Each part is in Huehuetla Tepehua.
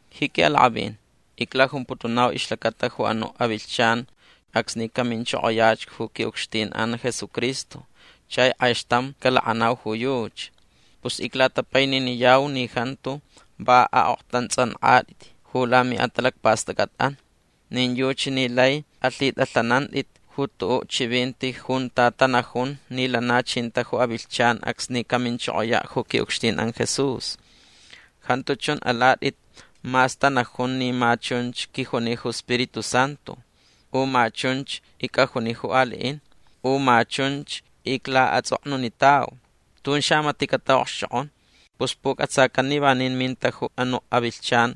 Ji quiʼalakʼavin iclajumputunau ixlacata ju anuʼ avilhchan acsni caminchokoyach ju quiʼucxtinʼan Jesucristo chai kʼaixtam calakʼanau ju yuchi. Pus iclatapaininiyau ni jantu va aʼoktantsʼankʼatʼit ju lamiʼatalacpastʼacʼatʼan. Nin yuchi ni lai alhitʼalhanantʼit ju tuʼuʼ chivinti junta tanajun ni lana chinta ju avilhchan acsni caminchokoyaʼ ju quiʼucxtinʼan Jesús. Jantu chun alatʼit mas tanajun ni ma chunch quijuni ju Spiritu Santu. U ma chunch icʼajuni ju aliʼin. U ma chunch iclaʼatsʼoknunitau. Tun xamatiʼ cataʼokxchokʼon. Pus pucʼatsacan ni vanin minta ju anuʼ avilhchan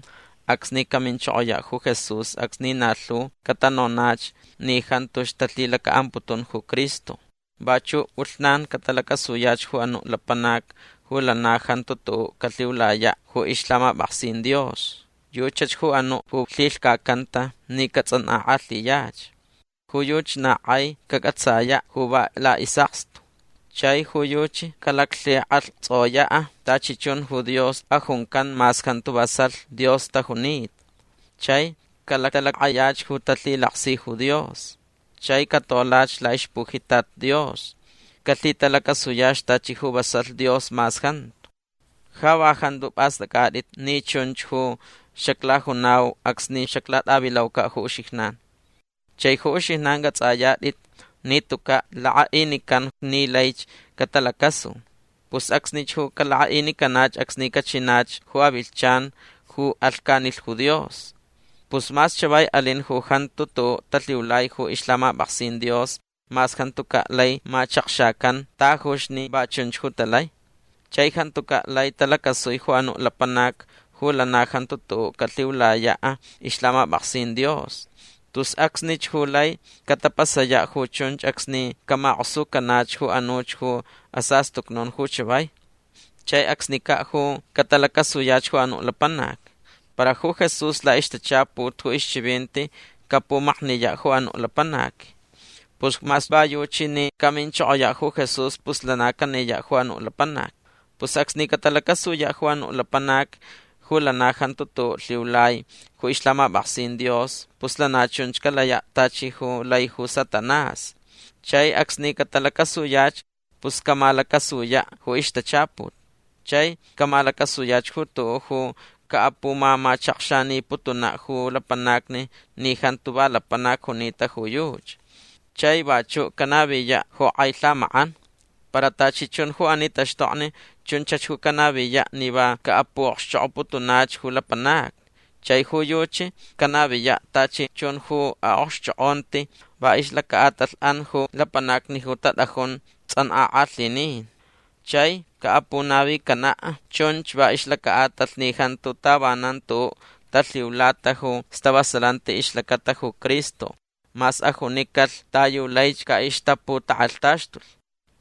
acsni caminchokoyaʼ ju Jesús acsni na lhu catanonach ni jantuch talhilacaʼamputun ju Cristo. Vachuʼ pʼulhnan catalacasuyach ju anuʼ lapanac ju lana jantu tuʼuʼ calhiulayaʼ ju ixlhamapʼaksin Dios. Yuchach ju anuʼ ju lhilhcacanta ni catsʼankʼakʼalhiyach. Ju yuchi na kʼai cacʼatsayaʼ ju va laʼisʼakstu. Chai ju yuchi calaclhikʼalhtsoyaʼ tachi chun ju dios ajuncan mas jantu vasalh Dios tajunita. Chai calactʼalakʼayach ju talhilaksi ju Dios. Chai catolach laʼixpujitat Dios. Calhitalacasuyach tachi ju vasalh Dios mas jantu. Ja va jantu pʼastʼacʼatʼit ni chunch ju xaclajunau acsni xaclatʼavilaucaʼ ju uxijnan. Chai ju uxijnan cʼatsʼayatʼit ni tucaʼ lakʼaʼinican ni laich catalacasu. Pus acsnich ju calakʼaʼinicanach acsni cachinach ju avilhchan ju alhcanilh ju Dios. Pus mas chavai alin ju jantu tuʼuʼ talhiulai ju ixlhamapʼaksin Dios mas jantucaʼ lai machakxacan tajuch ni va chunch ju talai. Chai jantucaʼ lai talacasui ju anuʼ lapanac ju lana jantu tuʼuʼ calhiulayaʼ ixlhamapʼaksin Dios. Tus acsnich ju lai catapasayaʼ ju chunch acsni camakʼosucanach ju anuch ju asastucnun ju chavai. Chai acsnicaʼ ju catalacasuyach ju anuʼ lapanac. Para ju Jesús laʼixtachaput ju ixchivinti capumakniyaʼ ju anuʼ lapanac. Pus mas va yuchi ni caminchokoyaʼ ju Jesús pus lana caniyaʼ ju anuʼ lapanac. Pus acsni catalacasuyaʼ ju anuʼ lapanac ju lana jantu tuʼuʼ lhiulai ju ixlhamapʼaksin Dios pus lana chunch calayaʼ tachi ju lai ju Satanás. Chai acsni catalacasuyach pus camalacasuyaʼ ju ixtachaput. Chai camalacasuyach ju tuʼuʼ ju caʼapumamachakxaniputunaʼ ju lapanacni ni jantu va lapanac junita ju yuchi. Chai vachuʼ canaviyaʼ ju kʼai lhamakʼan. Para tachi chun ju ani taxtokni chunchach ju canaviyaʼ ni va caʼapuʼokxchokʼoputunach ju lapanacni. Chai ju yuchi canaviyaʼ tachi chun ju aʼokxchokʼonti va ixlacaʼatalhʼan ju lapanacni ju tatʼajun tsʼankʼakʼalhinin. Chai caʼapunavicanaʼ chunch va ixlacaʼatalh ni jantu tavanan tuʼuʼ talhiulata ju stavasalanti ixlacata ju Cristo mas ajunicalh ta yu laich caʼixtaputakʼalhtaxtulh.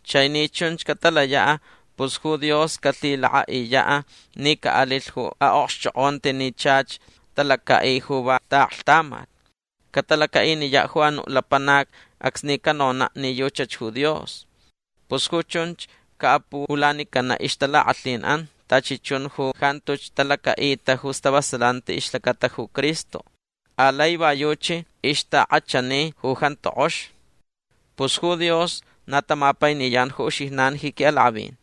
Chai ni chunch catalayaʼ pus ju Dios calhilakʼaʼiyaʼ ni caʼalilh ju aʼokxchokʼonti ni chach talacaʼi ju va taʼaklhtamat. Catalacaʼiniyaʼ ju anuʼ lapanac acsni canonaʼ ni yuchach ju Dios. Pus ju chunch caʼapuʼulanicanaʼ ixtalakʼalhinʼan tachi chun ju jantuch talacaʼita ju stavasalanti ixlacata ju Cristo. Alai va yuchi ixtakʼachani ju jantu kʼox. Pus ju Dios na tamapainiyan ju uxijnan ji quiʼalakʼavin.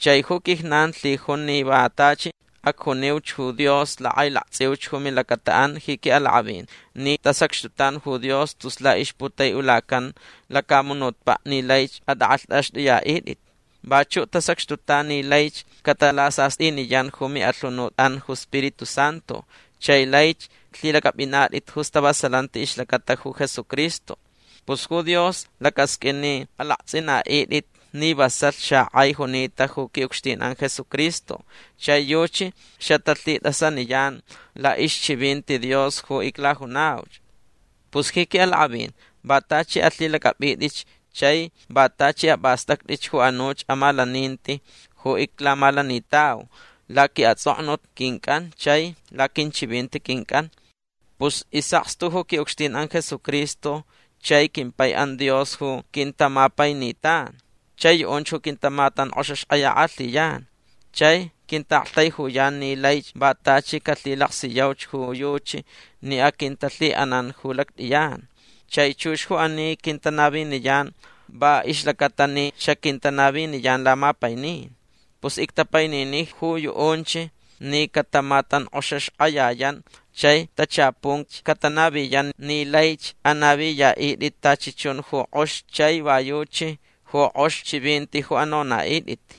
Chai ju quijnan lhijun ni va tachi acjuniuch ju Dios lakʼailaktsʼiuch ju milacataʼan ji quiʼalakʼavin ni tasacxtutan ju Dios tus laʼixputaiʼulacan lacamunutpaʼ ni laich atʼakʼalhtʼaxtʼuyaʼitʼit. Vachuʼ tasacxtutan ni laich catalasastʼiniyan ju miʼalhunutʼan ju Spiritu Santu chai laich lhilacʼapʼinatʼit ju stavasalanti ixlacata ju Jesucristo. Pus ju Dios lacasqʼuin ni alaktsʼinaʼitʼit ni vasalh xakʼai junita ju quiʼucxtinʼan Jesucristo chai yuchi xatalhitʼasaniyan laʼixchivinti Dios ju iclajunauch. Pus ji quiʼalakʼavin va tachi alhilacʼapʼitʼitch chai va tachi apʼastʼactʼitch ju anuch amalaninti ju iclamalanitau laquiʼatsʼoknut quincʼan chai laquinchivinti quincʼan. Pus isʼakstu ju quiʼucxtinʼan Jesucristo chai quimpaiʼan Dios ju quintamapainitan. Chai yuʼunch ju quintamatankʼoxaxkʼayakʼalhiyan. Chai quintaʼaktaijuyan ni laich va tachi calhilaksiyauch ju yuchi ni aquintalhiʼanan ju lactʼiyan. Chai chux ju ani quintanaviniyan va ixlacata ni xaquintanaviniyan lamapainin. Pus ictapainini ju yuʼunch ni catamatankʼoxaxkʼayayan chai tachapunch catanaviyan ni laich anaviyaʼitʼit tachi chun ju kʼox chai va yuchi ju kʼox chivinti ju anonaʼitʼit.